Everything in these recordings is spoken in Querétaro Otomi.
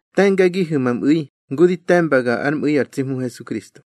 Te̱ngagihu̱ ma mꞌu̱i ngu di te̱mbaga ár mꞌu̱i ar tsi Hmu Hesukristo.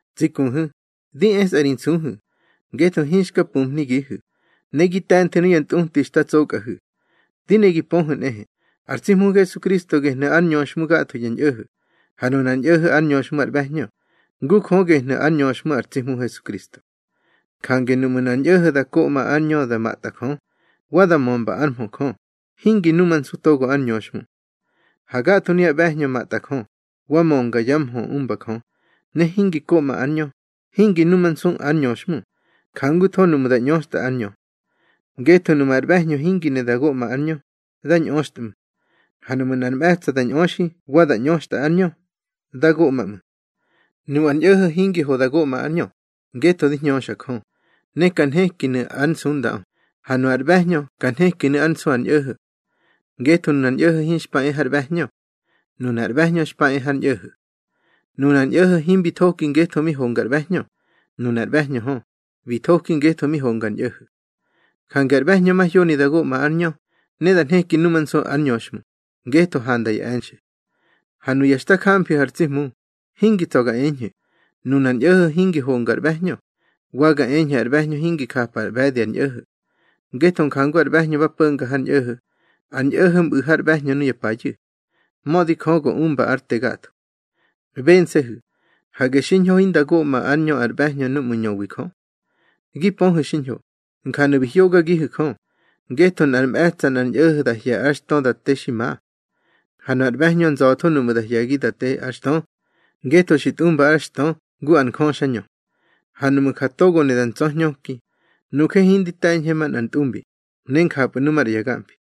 Tsi kuhu̱, di esꞌa ri nsuhu̱, ngetho hinxka pumhnigihu̱, ne gi te̱nthu̱ nuya ntꞌuti da tsokꞌahu̱. Di ne gi pöhu̱ nꞌehe, ar tsi Hmu Hesukristo gehnu̱ ár ñöxhmu gatho ya ñꞌo̱ho̱, ha nunar ñꞌo̱ho̱ ár ñöxhmu ár ꞌbe̱hñö, ngu Jö gehnu̱ ár ñöxhmu ar tsi Hmu Hesukristo. Jange nuꞌmu̱ nꞌar ñꞌo̱ho̱ koꞌma ár ñö da matꞌa Jö, wa da mömba ár mhö Jö, hingi numansu togo ár ñöxhmu. Ha gatho nuya ꞌbe̱hñö matꞌa Jö, wa mönga ya mhö umba Jö, ne hingi koꞌma ár ñö, hingi numansu ár ñöxhmu, jangutho nuꞌmu̱ da ꞌñöxtꞌa ár ñö. Ngetho nuꞌmu̱ ar ꞌbe̱hñö hingi ne da goꞌma ár ñö, dá ñꞌöxtꞌmu̱. Ha nuꞌmu̱ nꞌar mꞌe̱tsa̱ da ñꞌöxi wa da ꞌñöxtꞌa ár ñö, dá goꞌma ꞌmu̱. Nu ar ñꞌo̱ho̱ hingi ho da goꞌma ár ñö, ngetho di hñöxa Jö, ne ka nhekinu̱ ár nsundaꞌö, ha nu ar ꞌbe̱hñö ka nhekinu̱ ár nsu ar ñꞌo̱ho̱. Ngetho nunar ñꞌo̱ho̱ hinxpa e har ꞌbe̱hñö. Nunar ꞌbe̱hñö xpa e har ñꞌo̱ho̱. Nunar ñꞌo̱ho̱ himbi thoki ngetho mi honga ar ꞌbe̱hñö, nunar ꞌbe̱hñö hö, bi thoki ngetho mi honga ar ñꞌo̱ho̱. Jange ar ꞌbe̱hñö mahyoni da goꞌma ár ñö, ne da nheki numansu ár ñöxhmu, ngetho handa ya e̱nxe̱. Ha nuya xta jamfihu̱ ar tsi Hmu, hingi tsa̱ ga eñhu̱, nunar ñꞌo̱ho̱ hingi honga ar ꞌbe̱hñö, wa ga eñhu̱ ar ꞌbe̱hñö hingi japa ar ꞌbe̱di ar ñꞌo̱ho̱. Ngetho jangu ar ꞌbe̱hñö ba po̱nga har ñꞌo̱ho̱, ar ñꞌo̱ho̱ mꞌu̱ har ꞌbe̱hñö nuya payu̱. Mödi Jö go umba ár te gatho. Bense̱hu̱, hage xiñho hinda goꞌma ár ñö ar ꞌbe̱hñö núꞌmu̱ ñöwi Jö. Gi pöhu̱ xiñho, njanu̱ bi hyogagihu̱ Jö, ngetho nꞌar mꞌe̱tsa̱ nꞌar ñꞌo̱ho̱ da hye̱ ár xtö da te xi ma. Ha nu ar ꞌbe̱hñö nza̱tho nuꞌmu̱ da hye̱gi da te ár xtö, ngetho xi tꞌumba ár xtö ngu ar njöxañö. Ha nuꞌmu̱ ja togo ne da ntsa̱ñhöki, nuje hindi te̱ñhe manꞌar ntꞌumbi, ne njapꞌu̱ nu maꞌra ya gamfi.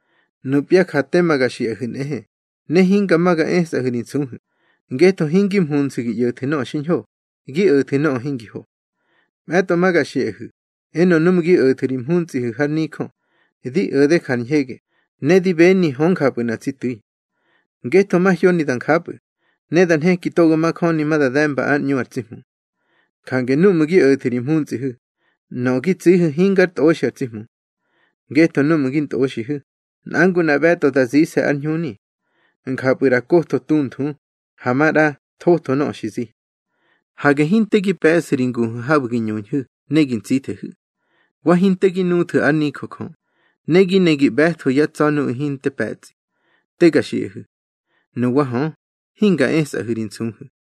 Nupya ja tema ga xiꞌahu̱ nꞌehe, ne hinga ma ga esꞌahu̱ ri nsuhu̱, ngetho hingi mhunsu̱ gi ꞌyo̱thu̱ nöꞌö xiñho, gi o̱thu̱ nöꞌö hingi ho. Mꞌe̱tꞌo ma ga xiꞌahu̱, enö núꞌmu̱ gi o̱thu̱ ri mhuntsꞌihu̱ har nijö, di o̱de jar ñhege, ne di beni hö njapꞌu̱ nꞌa tsi tu̱i. Ngetho mahyoni da njapꞌu̱, ne da nheki togo majöni ma da de̱mba ár ꞌñu ar tsi Hmu. Jange núꞌmu̱ gi o̱thu̱ ri mhuntsꞌihu̱, nöꞌö gi tsihu̱ hingár tꞌoxi ar tsi Hmu. Ngetho núꞌmu̱ gi ntꞌoxihu̱, nꞌa ngu nꞌa ꞌbe̱tꞌo da zise̱ ár ñhuni. Njapꞌu̱ ꞌra kotho tunthu, ha maꞌra thotho nöꞌö xi zi. Hage hinte gi pe̱ꞌsu̱ ri nguhu̱ habu̱ gi ñuñhu̱ ne gi ntsithehu̱. Wa hinte gi nuthwu̱ ár nijö Jö, ne gi ne gi ꞌbe̱thwu̱ yá tsa̱ nuꞌu̱ hinte pe̱tsꞌi. Te ga xiꞌahu̱. Nuwa hö, hinga esꞌahu̱ ri nsuhu̱.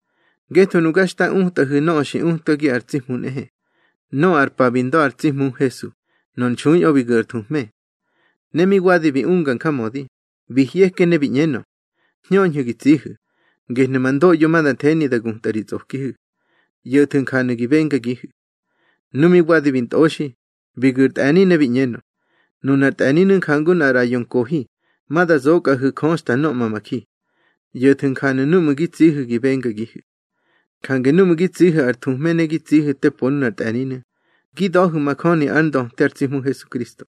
Ngetho nuga xta utꞌahu̱ nöꞌö xi utkagi ar tsi Hmu nꞌehe: Nöꞌö ar pa bi nda̱ ar tsi Hmu Hesu, nor nxuiꞌö bi gu̱ ar thuhme. Ne mi wadi bi unga njamödi, bi hyeke ne bi ꞌñenö: Hñöñhu̱ gi tsihu̱, gehnu̱ ma ndoꞌyo ma da theni da gutꞌa ri tsꞌokihu̱. ꞌYo̱thu̱ njanu̱ gi bengagihu̱. Nu mi wadi bi ntꞌoxi, bi gu̱ ar tꞌe̱ni ne bi ꞌñenö: Nunar tꞌe̱ninu̱ jangu nꞌar ꞌraꞌyo nkohi ma da zokꞌahu̱ Jö xta nhöꞌma ma ji. ꞌYo̱thu̱ njanu̱ núꞌmu̱ gi tsihu̱ gi bengagihu̱. Jange núꞌmu̱ gi tsihu̱ ar thuhme ne gi tsihu̱ te po nunar tꞌe̱ninu̱, gi da̱hu̱ majöni ár ndöte ar tsi Hmu Hesukristo.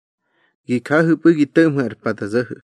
Gi jahu̱pꞌu̱ gi to̱ꞌmhu̱ ar pa da zo̱ho̱.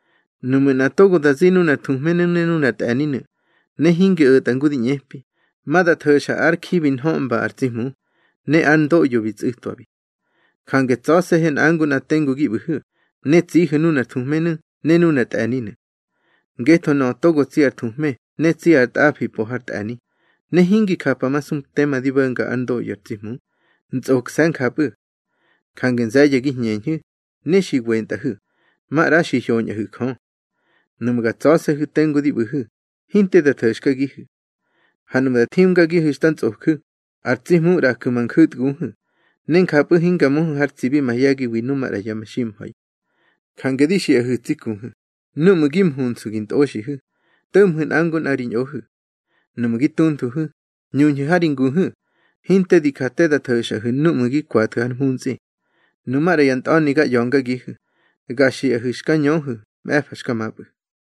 Nuꞌmu̱ nꞌa togo da zi nunar thuhmenu̱ ne nunar tꞌe̱ninu̱, ne hingi o̱tꞌa ngu di ꞌñepi, ma da tho̱xa ár ji bi nhöꞌmbabi ar tsi Hmu, ne ár ndoꞌyo bi tsꞌu̱tꞌwabi. Jange tsa̱se̱hu̱ nꞌa ngu nꞌa tengu gi ꞌbu̱hu̱, ne tsihu̱ nunar thuhmenu̱ ne nunar tꞌe̱ninu̱. Ngetho nöꞌö togo tsi ar thuhme ne tsi ar tꞌafi po har tꞌe̱ni, ne hingi japamasu tema di bo̱nga ár ndoꞌyo ar tsi Hmu, ntsꞌokse̱ njapꞌu̱. Jange nze̱ye̱ gi hñeñhu̱, ne xi wentꞌahu̱, maꞌra xi hyoñꞌahu̱ Jö. Nuꞌmu̱ ga tsa̱se̱hu̱ tengu di ꞌbu̱hu̱, hinte da tho̱xkagihu̱. Ha nuꞌmu̱ da thimgagihu̱ xta ntsꞌoju̱, ar tsi Hmu ꞌraju̱ ma nju̱tguhu̱, ne njapꞌu̱ hinga möhu̱ har tsibi mahye̱giwi nu maꞌra ya meximha̱i. Jange di xiꞌahu̱ tsi kuhu̱, núꞌmu̱ gi mhunsu̱ gi ntꞌoxihu̱, to̱ꞌmhu̱ nꞌa ngu nꞌa ri ñꞌohu̱. Nuꞌmu̱ gi tunthuhu̱, ñuñhu̱ ha ri nguhu̱, hinte di ja te da tho̱xꞌahu̱ núꞌmu̱ gi kwathu̱ har mhuntsꞌi. Nu maꞌra ya ntꞌa̱ni ga ꞌya̱ngagihu̱, ga xiꞌahu̱ xka ñöhu̱ mꞌe̱fa xka mapꞌu̱.